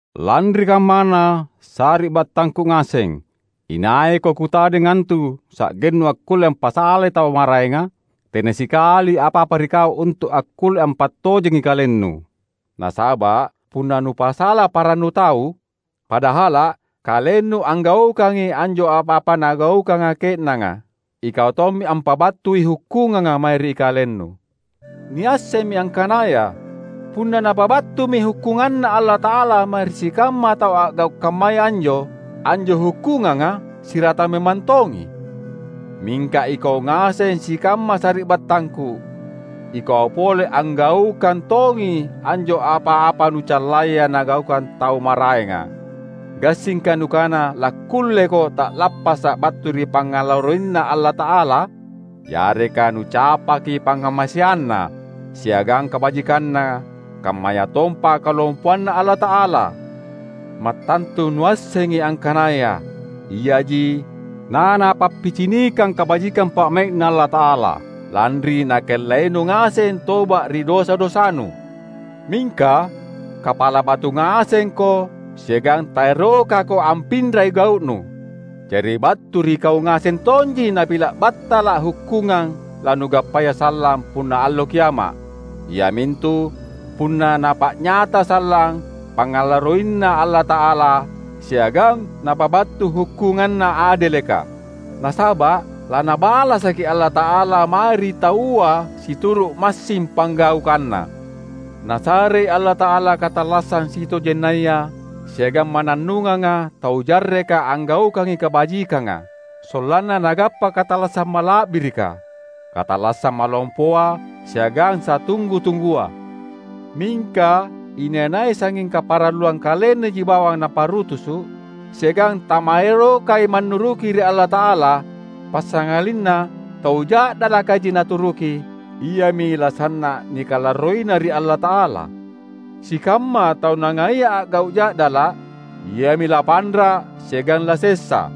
Lanri kammana, sari’battangku ngaseng, inaiko kutadeng antu sa’gennu akkulle ampasalai tau maraenga? Tena sikali apa-apa ri kau untu’ akkulle ampattojengi kalennu! Nasaba’ punna nupasala parannu tau, padahala’ kalennu anggaukangi anjo apa-apa nagaukanga ke’nanga, ikau tommi ampabattui hukkunganga mae ri kalennu. Niassemmi angkanaya punna Napabattumi hukkunganNa Allata’ala mae ri sikamma tau a’gau’ kammaya anjo, anjo hukkunganga siratang memang tongi. Mingka ikau ngaseng sikamma sari’battangku, ikau pole anggaukang tongi anjo apa-apa nucallaya nagaukang tau maraenga. Gassingka nukana lakkulleko ta’lappasa’ battu ri pangngalarroiNa Allata’ala? Yareka nucapaki pangngamaseanNa siagang kabajikanNa kammayatompa kalompoanNa Allata’ala? Mattantu nuassengi angkanaya iaji naNapappicinikang kabajikang pa’mai’Na Allata’ala, lanri nakellainu ngaseng toba’ ri dosa-dosanu. Mingka kapala batu ngasengko siagang taerokako ampinrai gau’nu. Jari battu ri kau ngaseng tonji napila’ battala’ hukkungang lanugappaya sallang punna Allo Kiama’, iamintu punna Napa’nyata sallang pangngalarroiNa Allata’ala siagang Napabattu hukkunganNa adeleka. Nasaba’ laNabalasaki Allata’ala mae ri taua situru’ massing panggaukanna. Nasarei Allata’ala katallassang sitojennaya siagang mannannunganga tau jarreka anggaukangi kabajikanga, sollanna nagappa katallassang mala’birika, katallassang malompoa siagang satunggu-tunggua. Mingka inai-nai sangnging kaparalluang kalennaji bawang naparutusu’, siagang tamaerokai mannuruki ri Allata’ala, passangalinna tau ja’dalakaji naturuki, iami lasanna’ nikalarroina ri Allata’ala. Sikamma tau nangaia a’gau’ ja’dala’, iami lapanra’ siagang lasessa;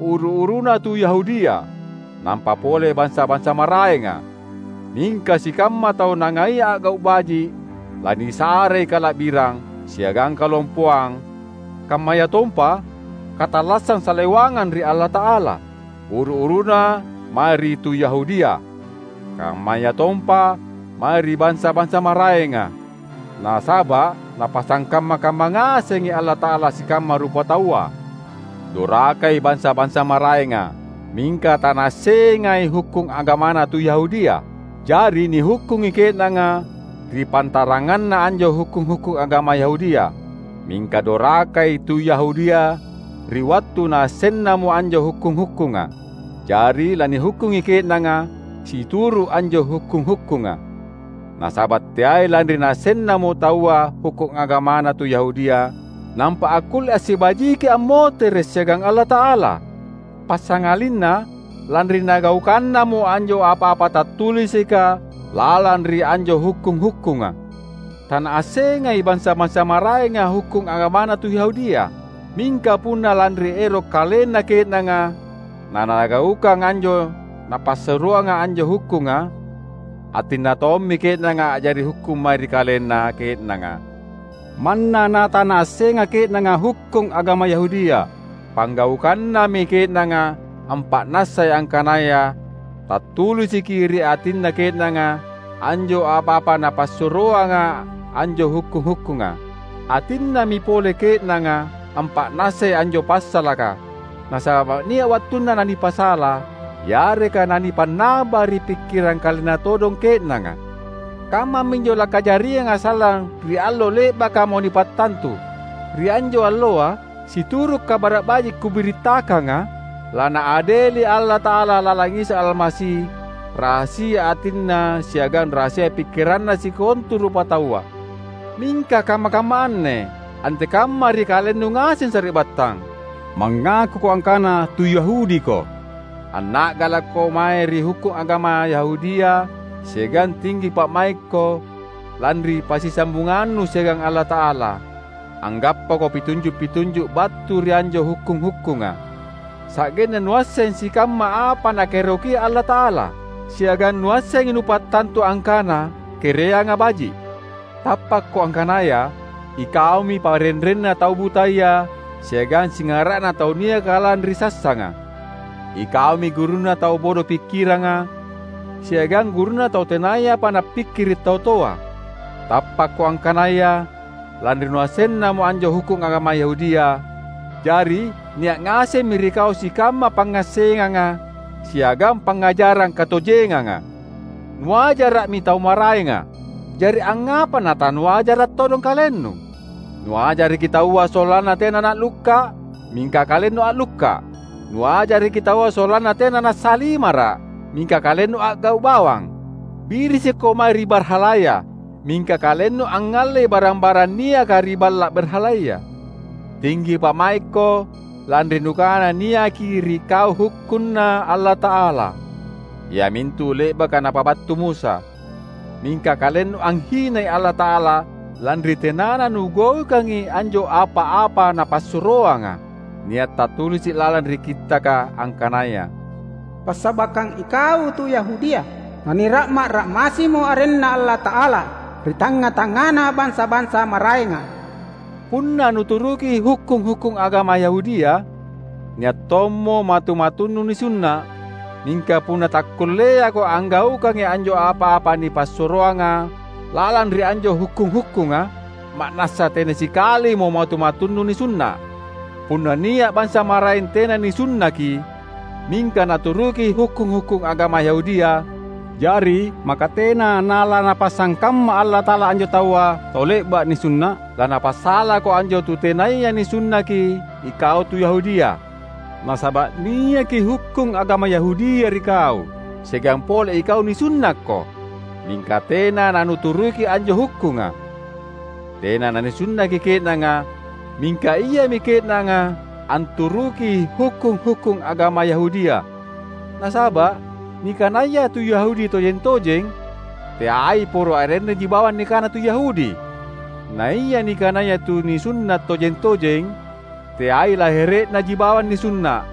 uru-uruna tu Yahudia, nampa pole bansa-bansa maraenga. Mingka sikamma tau nangaia a’gau’ baji’ lanisarei kala’birang, siagang kalompoang kammayatompa katallassang salewangang ri Allata’ala; uru-uruna mae ri tu Yahudia, kammayatompa mae ri bansa-bansa maraenga. Nasaba’ Napasangkamma-kamma ngasengi Allata’ala sikamma rupataua. Dorakai bansa-bansa maraenga, mingka tanaassengai hukkung agamana tu Yahudia. Jari nihukkungi ke’nanga ri pantaranganna anjo hukkung-hukkung agama Yahudia. Mingka dorakai tu Yahudia ri wattu naassennamo anjo hukkung-hukkunga; jari lanihukkungi ke’nanga situru’ anjo hukkung-hukkunga. Nasaba’ teai lanri naassennamo taua hukkung agamana tu Yahudia nampa akkulle assibajiki ammotere’ siagang Allata’ala; passangalinna lanri nagaukannamo anjo apa-apa tattulisika lalang ri anjo hukkung-hukkunga. Tanaassengai bansa-bansa maraenga hukkung agamana tu Yahudia. Mingka punna lanri ero’ kalenna ke’nanga nanagaukang anjo napassuroanga anjo hukkunga, atinna tommi ke’nanga a’jari hukkung mae ri kalenna ke’nanga, manna natanaassenga ke’nanga hukkung agama Yahudia. Panggaukannami ke’nanga ampa’nassai angkanaya tattulisiki ri atinna ke’nanga anjo apa-apa napassuroanga anjo hukkung-hukkunga. Atinnami pole ke’nanga ampa’nassai anjo passalaka, nasaba’ nia’ wattunna nanipasala yareka nanipannaba ri pikkirang kalenna todong ke’nanga. Kammaminjo lakajarianga sallang ri allo le’bakamo nipattantu. Ri anjo alloa — situru’ Kabara’ Baji’ kubirittakanga — laNaadeli Allata’ala lalang Isa Almasi rahasia atinna siagang rahasia pikkiranna sikontu rupataua. Mingka kamma-kamma anne, antekamma ri kalennu ngaseng sari’battang? Mangakuko angkana tu Yahudiko. Anna’galakko mae ri hukkung agama Yahudia siagang tinggi pa’maikko lanri passisambungannu siagang Allata’ala. Anggappako pitunju’-pitunju’ battu ri anjo hukkung-hukkunga, sa’genna nuasseng sikamma apa Nakaerokia Allata’ala, siagang nuassengi nupattantu angkana kereanga baji’. Tappakko angkanaya ikaumi parenrenna tau butaya siagang singara’na tau niaka lalang ri sassanga; ikaumi gurunna tau bodo pikkiranga, siagang gurunna tau tenayapa nappikkiri’ tau toa. Tappakko angkanaya lanri nuassenna anjo hukkung agama Yahudia, jari nia’ ngasemmi ri kau sikamma pangngassenganga siagang pangngajarang katojenganga. Nuajara’mi tau maraenga; jari angngapa natanuajarra todong kalennu? Nuajaraki taua sollanna tena na’lukka’; mingka kalennu a’lukka’! Nuajaraki taua sollanna tena nassalimara’; mingka kalennu a’gau’ bawang! Birisikko mae ri barhalaya; mingka kalennu angngallei barang-barang niaka ri balla’ barhalaya. Tinggi pa’maikko lanri nukana niaki ri kau hukkunNa Allata’ala, iamintu le’baka napabattu Musa; mingka kalennu anghinai Allata’ala lanri tenana nugaukangi anjo apa-apa Napassuroanga! Nia’ tattulisi’ lalang ri Kittaka, angkanaya, "Passabakkang ikau tu Yahudia, nanira’ma’-ra’massimo arenNa Allata’ala ri tangnga-tangngana bansa-bansa maraenga." Punna nuturuki hukkung-hukkung agama Yahudia, nia’ tommo matu-matunnu nisunna’. Mingka punna takkulleako anggaukangi anjo apa-apa nipassuroanga lalang ri anjo hukkung-hukkunga, ma’nassa tena sikalimo matu-matunnu nisunna’. Punna nia’ bansa maraeng tena nanisunnaki, mingka naturuki hukkung-hukkung agama Yahudia, jari maka tena nalaNapasangkamma Allata’ala anjo taua tau le’ba’ nisunna’? Lanapasalako anjo tu tenaya nisunnaki ikau tu Yahudia. Nasaba’ niaki hukkung agama Yahudia ri kau, siagang pole ikau nisunnakko, mingka tena nanuturuki anjo hukkunga. Tena nanisunnaki ke’nanga, mingka iami ke’nanga anturuki hukkung-hukkung agama Yahudia. Nasaba’ nikanaya tu Yahudi tojeng-tojeng, teai poro arennaji bawang nikana tu Yahudi; naia nikanaya tu nisunna’ tojeng-tojeng, teai lahere’naji bawang nisunna’.